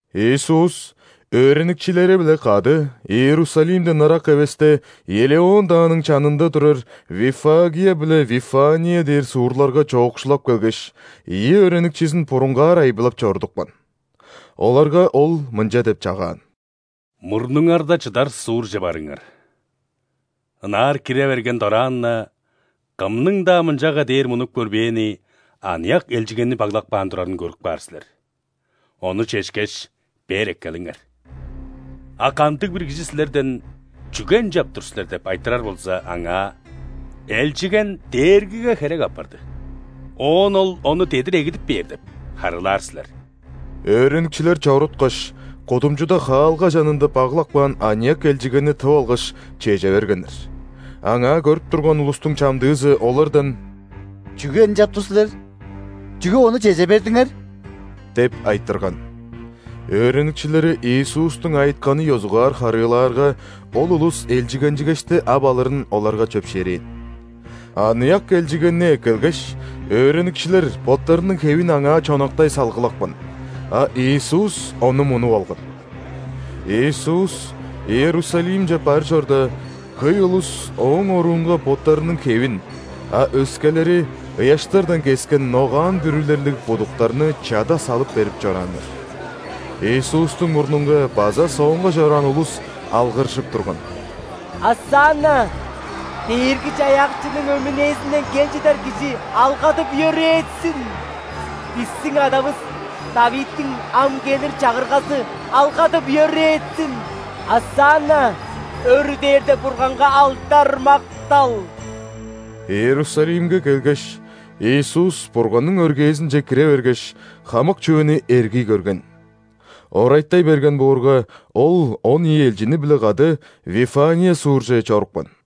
Иисус өөреникчилери-биле кады Иерусалимден ырак эвесте Елеон дааның чанында турар Виффагия биле Вифания дээр суурларга чоокшулап келгеш, ийи өөреникчизин бурунгаар айбылап чорудупкан. Оларга Ол мынча деп чагаан: «Мурнуңарда чыдар суурже барыңар. Ынаар кире берген дораан-на, кымның-даа мынчага дээр мунуп көрбээни аныяк элчигенни баглап каан турарын көрүп каар силер. Ону чешкеш, бээр эккелиңер. А кандыг-бир кижи силерден: „Чүге ынчап тур силер?“ – деп айтырар болза, аңаа: „Элчиген Дээргиге херек апарды, оон Ол ону дедир эгидип бээр“ – деп харыылаар силер». Өөреникчилер чоруткаш, кудумчуда хаалга чанында баглап каан аныяк элчигенни тып алгаш, чеже бергеннер. Аңаа көрүп турган улустуң чамдыызы олардан: «Чүге ынчап тур силер? Чүге ону чеже бердиңер?» – деп айтырган. Өөреникчилери Иисустуң айытканын ёзугаар харыылаарга, ол улус элчигенчигешти ап алырын оларга чөпшээрээн. Аныяк элчигенни эккелгеш, өөреникчилер боттарының хевин аңаа чонактай салгылапкан, а Иисус ону мунуп алган. Иисус Иерусалимче бар чорда, хөй улус Ооң оруунга боттарының хевин, а өскелери – ыяштардан кескен ногаан бүрүлерлиг будуктарны чада салып берип чорааннар. Иисустуң мурнунга база соонга чораан улус алгыржып турган: «Осанна! Дээрги-Чаяакчының өмүнээзинден кел чыдар Кижи алгадып-йөрээтсин! Бистиң адавыс ·Давидтиң ам келир Чагыргазы алгадып-йөрээтсин! Осанна! Өрү дээрде Бурганга алдар-мактал!» Иерусалимге келгеш, Иисус Бурганның өргээзинче кире бергеш, хамык чүвени эргий көрген. Орайтай берген боорга, Ол он ийи элчини-биле кады Вифания суурже чорупкан.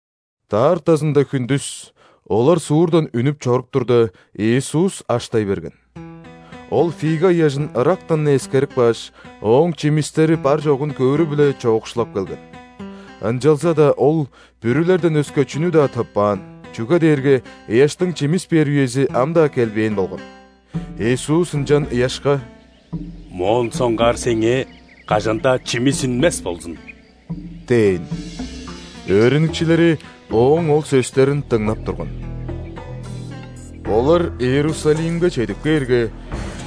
Даартазында хүндүс олар суурдан үнүп чоруп турда, Иисус аштай берген. Ол фига ыяжын ырактан-на эскерип кааш, ооң чимистери бар-чогун көөрү-биле чоокшулап келген. Ынчалза-даа Ол бүрүлерден өске чүнү-даа тыппаан, чүге дээрге ыяштың чимис бээр үези ам-даа келбээн болган. Иисус ынчан ыяшка: «Моон соңгаар сеңээ кажан-даа чимис үнмес болзун!» – дээн. Өөреникчилери Ооң ол сөстерин дыңнап турган. Олар Иерусалимге чедип кээрге,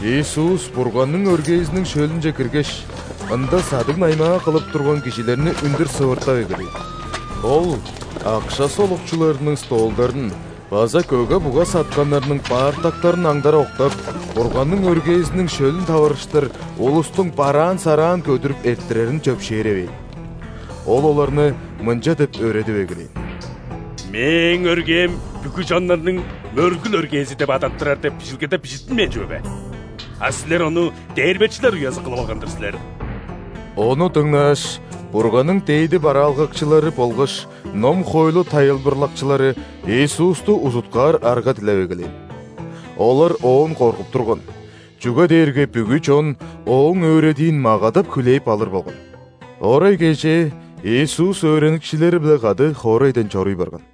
Иисус Бурганның өргээзиниң шөлүнче киргеш, ында садыг-наймаа кылып турган кижилерни үндүр сывыртап эгелээн. Ол акша солукчуларының столдарын база көге-буга сатканнарның баартактарын аңдара октап, Бурганның өргээзиниң шөлүн таварыштыр улустуң бараан-сараан көдүрүп эрттирерин чөпшээревээн. Ол оларны мынча деп өөредип эгелээн: «„Мээң өргээм бүгү чоннарның мөргүл өргээзи деп адаттырар“ деп, Бижилгеде бижиттинмээн чүве бе? А силер ону дээрбечилер уязы кылып алган-дыр силер!» Ону дыңнааш, Бурганның дээди бараалгакчылары болгаш ном-хоойлу тайылбырлакчылары Иисусту узуткаар арга дилеп эгелээн. Олар Оон коргуп турган, чүге дээрге бүгү чон Ооң өөредиин магадап хүлээп алыр болган. Орай кежээ Иисус өөреникчилери-биле кады хоорайдан чоруй барган.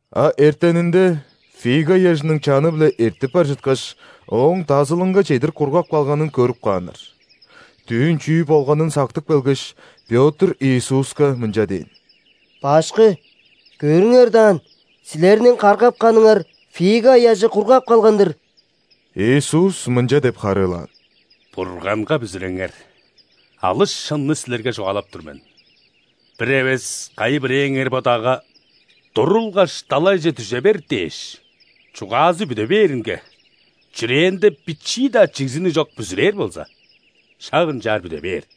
А эртенинде, фига ыяжының чаны-биле эртип бар чыткаш, ооң дазылынга чедир кургап калганын көрүп кааннар. Дүүн чүү болганын сактып келгеш, Пётр Иисуска мынча дээн: «Башкы! Көрүңер даан, Силерниң каргапканыңар фига ыяжы кургап калган-дыр!» Иисус мынча деп харыылаан: «Бурганга бүзүреңер! Алыс шынны силерге чугаалап тур мен: бир эвес кайы-бирээңер бо дагга: „Турулгаш, далайже дүже бер“ – дээш, чугаазы бүде бээринге чүрээнде бичии-даа чигзиниг чок бүзүрээр болза, шак ынчаар бүде бээр.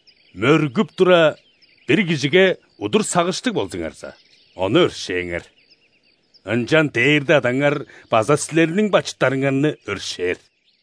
Мөргүп тура, бир кижиге удур сагыштыг болзуңарза, ону өршээңер. Ынчан Дээрде Адаңар база силерниң бачыттарыңарны өршээр».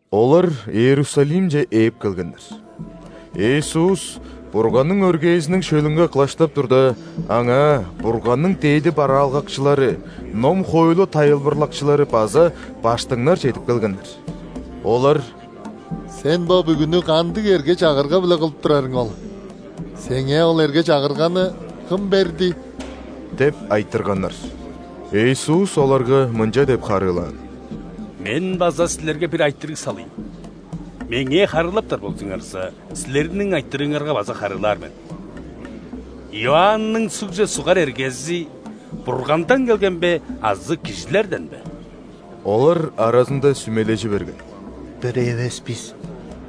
Олар Иерусалимче ээп келгеннер. Иисус Бурганның өргээзиниң шөлүнге кылаштап турда, Аңаа Бурганның дээди бараалгакчылары, ном-хоойлу тайылбырлакчылары база ·баштыңнар чедип келгеннер. Олар: «Сен бо бүгүнү кандыг эрге-чагырга-биле кылып турарың ол? Сеңээ ол эрге-чагырганы кым берди?» – деп айтырганнар. Иисус оларга мынча деп харыылаан: «Мен база силерге бир айтырыг салыйн. Меңээ харыылаптар болзуңарза, силерниң айтырыыңарга база харыылаар мен. Иоанның ·сугже сугар эргези Бургандан келген бе азы кижилерден бе?» Олар аразында сүмележи берген: «Бир эвес бис: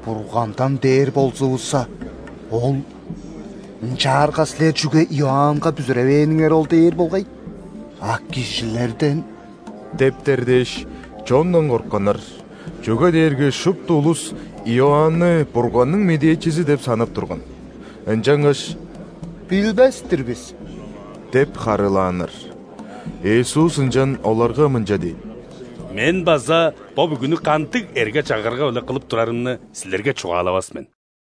„Бургандан“ – дээр болзувусса, Ол: „Ынчаарга силер чүге Иоаннга бүзүревээниңер ол?“ – дээр болгай». А: «Кижилерден» – дептер дээш, чондан кортканнар, чүге дээрге шупту улус Иоанны Бурганның медээчизи деп санап турган. Ынчангаш: «Билбес-тир бис» – деп харыылааннар. Иисус ынчан оларга мынча дээн: «Мен база бо бүгүнү кандыг эрге-чагырга-биле кылып турарымны силерге чугаалавас мен».